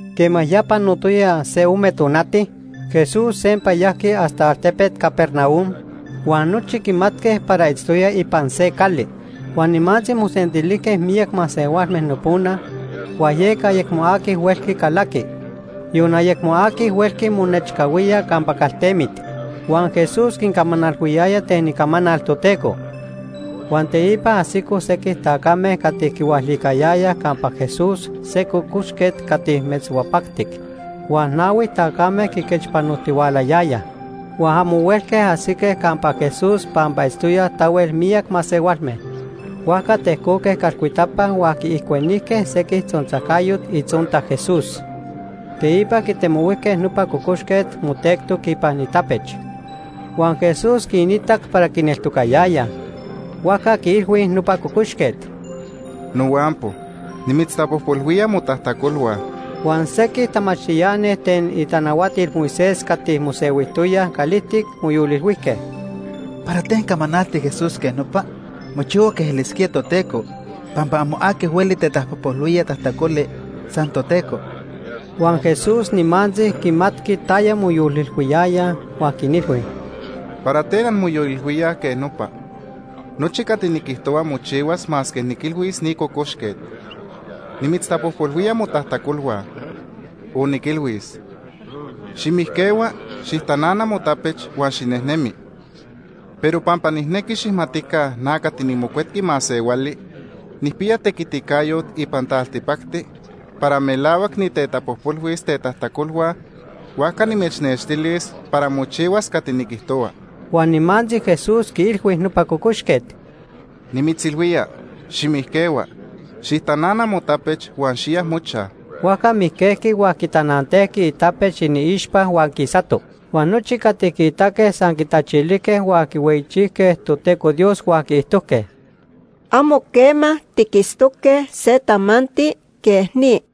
Quema ya panotoya se ome tonati, Jesús sempa yajqui hasta altepet Capernaum, huan nochi quimatque para itztoya ipan se cali. Huan nimantzi mosentilijque miyac masehualme nopona huan yeca ayecmo aqui huelqui calaqui, yon ayecmo aqui huelqui monechcahuía campa caltemit. Huan Jesús quincamanalhuiyaya ten icamanal Toteco. Huan teipa ajsicoj sequij tacame cati quihualicayayaj campa Jesús se cocoxquet cati metzhuapactic, huan nahui tacame quiquechpanojtihualayayaj. Huan amo huelque ajsique campa Jesús pampa itztoyaj tahuel miyac masehualme, huajca tejcoque calcuitapa huan quiijcuenijque sequij tzontzajcayot itzonta Jesús. Teipa quitemohuijque nopa cocoxquet motectoc ipan itapech. Huan Jesús quiitac para quineltocayayaj, huajca quiilhui nopa cocoxquet: ―Nohuampo nimitztapojpolhuía motajtacolhua. Huan sequij tamachtiani ten itanahuatil Moisés cati mosehuijtoyaj calijtic moyolilhuijque: “¿Para ten camanalti Jesús quej nopa? Mochihua quej elisquía Toteco, pampa amo aqui hueli tetapojpolhuía tajtacoli, san Toteco.” Huan Jesús nimantzi quimatqui taya moyolilhuiyayaj, huan quinilhui: ―¿Para ten anmoyolilhuíaj quej nopa? Nochi cati niquijtohua mochihuas masque niquilhuis ni cocoxquet: ‘Nimitztapojpolhuía motajtacolhua’, o niquilhuis: ‘Ximijquehua, xijtanana motapech huan xinejnemi.’ Pero pampa nijnequi xijmatica na cati niMocuetqui Masehuali, nijpiya tequiticayot ipan taltipacti para melahuac nitetapojpolhuis tetajtacolhua, huajca nimechnextilis para mochihuas cati niquijtohua. Huan nimantzi Jesús quiilhui nopa cocoxquet: ―Nimitzilhuía, ximijquehua, xijtanana motapech huan xiya mochaj. Huajca mijquejqui huan quitanantejqui itapech iniixpa huan quisato. Huan nochi cati quiitaque san quitachilijque huan quihueyichijque Toteco Dios huan quiijtojque: ―Amo quema tiquitztoque se tamanti quej ni.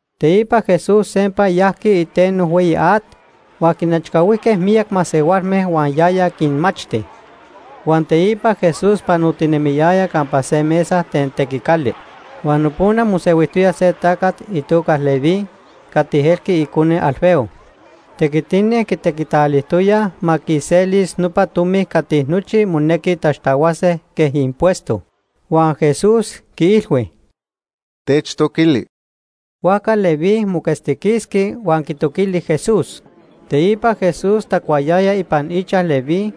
Teipa Jesús sempa yajqui iteno hueyi at, huan quinechcahuijque miyac masehualme huan yaya quinmachti. Huan teipa Jesús panotinemiyaya campa se mesa ten tequicali, huan nopona mosehuijtoya se tacat itoca Leví Leví nojquiya itoca Mateo. cati elqui icone Alfeo. Tequitini quitequitalijtoyaj ma quiselis nopa tomi cati nochi monequi taxtahuase quej impuesto. Huan Jesús quiilhui: ―Techtoquili. Huajca Leví moquetztiquisqui huan quitoquili Jesús. Teipa Jesús tacuayaya ipan ichaj Leví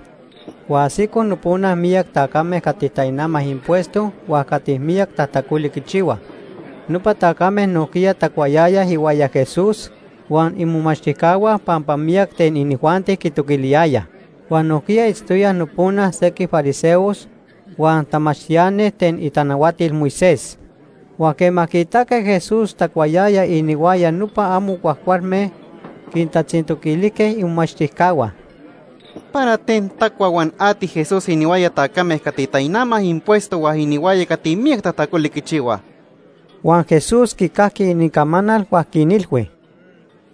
huan ajsicoj nopona miyac tacame cati tainamaj impuesto huan cati miyac tajtacoli quichihuaj. Nopa tacame nojquiya tacuayayaj ihuaya Jesús huan imomachtijcahua pampa miyac ten inijuanti quitoquiliyayaj. Huan nojquiya itztoyaj nopona sequij fariseos huan tamachtiani ten itanahuatil Moisés. Huan quema quiitaque Jesús tacuayaya inihuaya nopa amo cuajcualme, quintatzintoquilijque imomachtijcahua: ―¿Para ten tacua huan ati Jesús inihuaya tacame cati tainamaj impuesto huan inihuaya cati miyac tajtacoli quichihuaj? Huan Jesús quicajqui inincamanal huan quinilhui: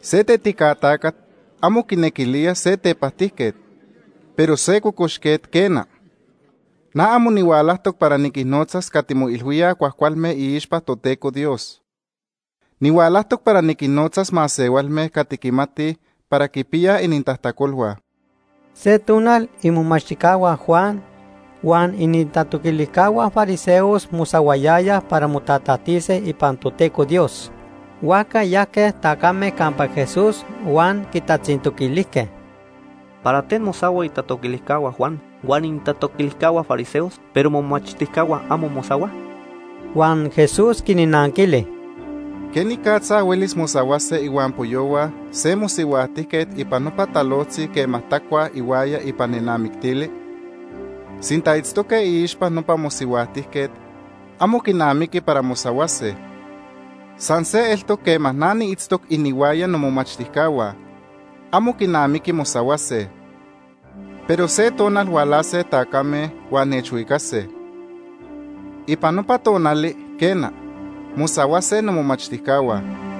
―Se tetica tacat amo quinequilía se tepajtijquet, pero se cocoxquet, quena. Na amo nihualajtoc para niquinnotzas cati moilhuíaj cuajcualme iixpa Toteco Dios. Nihualajtoc para niquinnotzas masehualme cati quimatij para quipiyaj inintajtacolhua. Se tonal imomachtijcahua Juan huan inintatoquilijcahua fariseos mosahuayayaj para motatajtise ipan Toteco Dios. Huajca yajque tacame campa Jesús huan quitatzintoquilijque: ―¿Para ten mosahuaj itatoquilijcahua Juan huan inintatoquilijcahua fariseos, pero momomachtijcahua amo mosahuaj? Huan Jesús quinnanquili: ―¿Quenicatza huelis mosahuase ihuampoyohua se mosihuajtijquet ipan nopa talojtzi quema tacuaj ihuaya ipan nenamictili? Sinta itztoque iixpa nopa mosihuajtijquet, amo quinamiqui para mosahuase. San se eltoc quema na niitztoc inihuaya nomomachtijcahua, amo quinamiqui mosahuase. Pero se tonal hualase tacame huan nechhuicase. Ipan nopa tonali, quena, mosahuase nomomachtijcahua.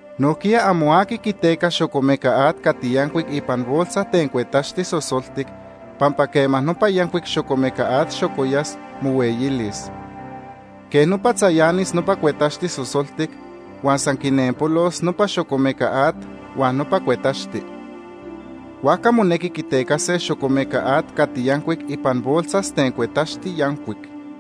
Nojquiya amo aqui quiteca xocomeca at cati yancuic ipan bolsas ten cuetaxti sosoltic, pampa quema nopa yancuic xocomeca at xocoyas, mohueyilis. Quej nopa tzayanis nopa cuetaxti sosoltic huan san quinenpolos nopa xocomeca at huan nopa cuetaxti. Huajca monequi quitecase xocomeca at cati yancuic ipan bolsas ten cuetaxti yancuic.’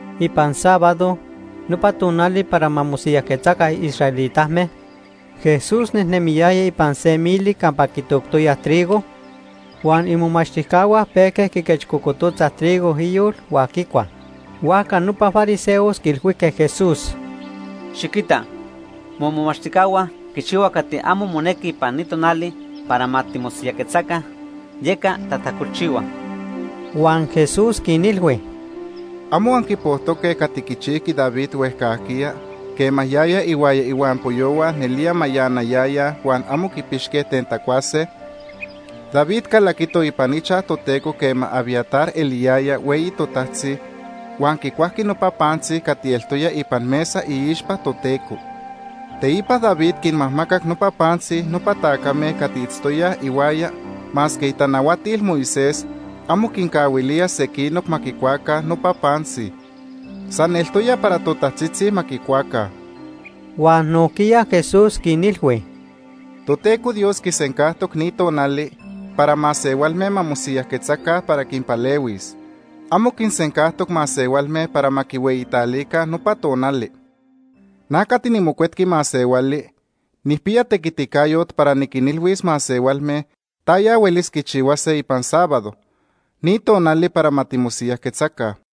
Ipan sábado, nopa tonali para ma mosiyajquetzaca israelitame, Jesús nejnemiyaya ipan se mili campa quitoctoyaj trigo, huan imomachtijcahua pejque quiquechcocototzaj trigo iyol huan quicuaj. Huajca nopa fariseos quiilhuijque Jesús: ―Xiquita, momomachtijcahua quichihuaj cati amo monequi ipan ni tonali para ma timosiyajquetzaca, yeca tajtacolchihuaj. Huan Jesús quinilhui: ―¿Amo anquipojtoque cati quichijqui David huejcajquiya quema yaya ihuaya ihuampoyohua nelía mayanayayaj huan amo quipixque ten tacuase? David calaquito ipan ichaj Toteco quema Abiatar eliyaya hueyi totajtzi, huan quicuajqui nopa pantzi cati eltoya ipan mesa iixpa Toteco. Teipa David quinmajmacac nopa pantzi nopa tacame cati itztoyaj ihuaya masque itanahuatil Moisés amo quincahuilía sequinoc ma quicuaca nopa pantzi. San eltoya para totajtzitzi ma quicuaca. Huan nojquiya Jesús quinilhui: ―Toteco Dios quisencajtoc ni tonali para masehualme ma mosiyajquetzaca para quinpalehuis. Amo quinsencajtoc masehualme para ma quihueyitalica nopa tonali. Na cati niMocuetqui Masehuali, nijpiya tequiticayot para niquinilhuis masehualme taya huelis quichihuase ipan sábado, ni tonali para ma timosiyajquetzaca.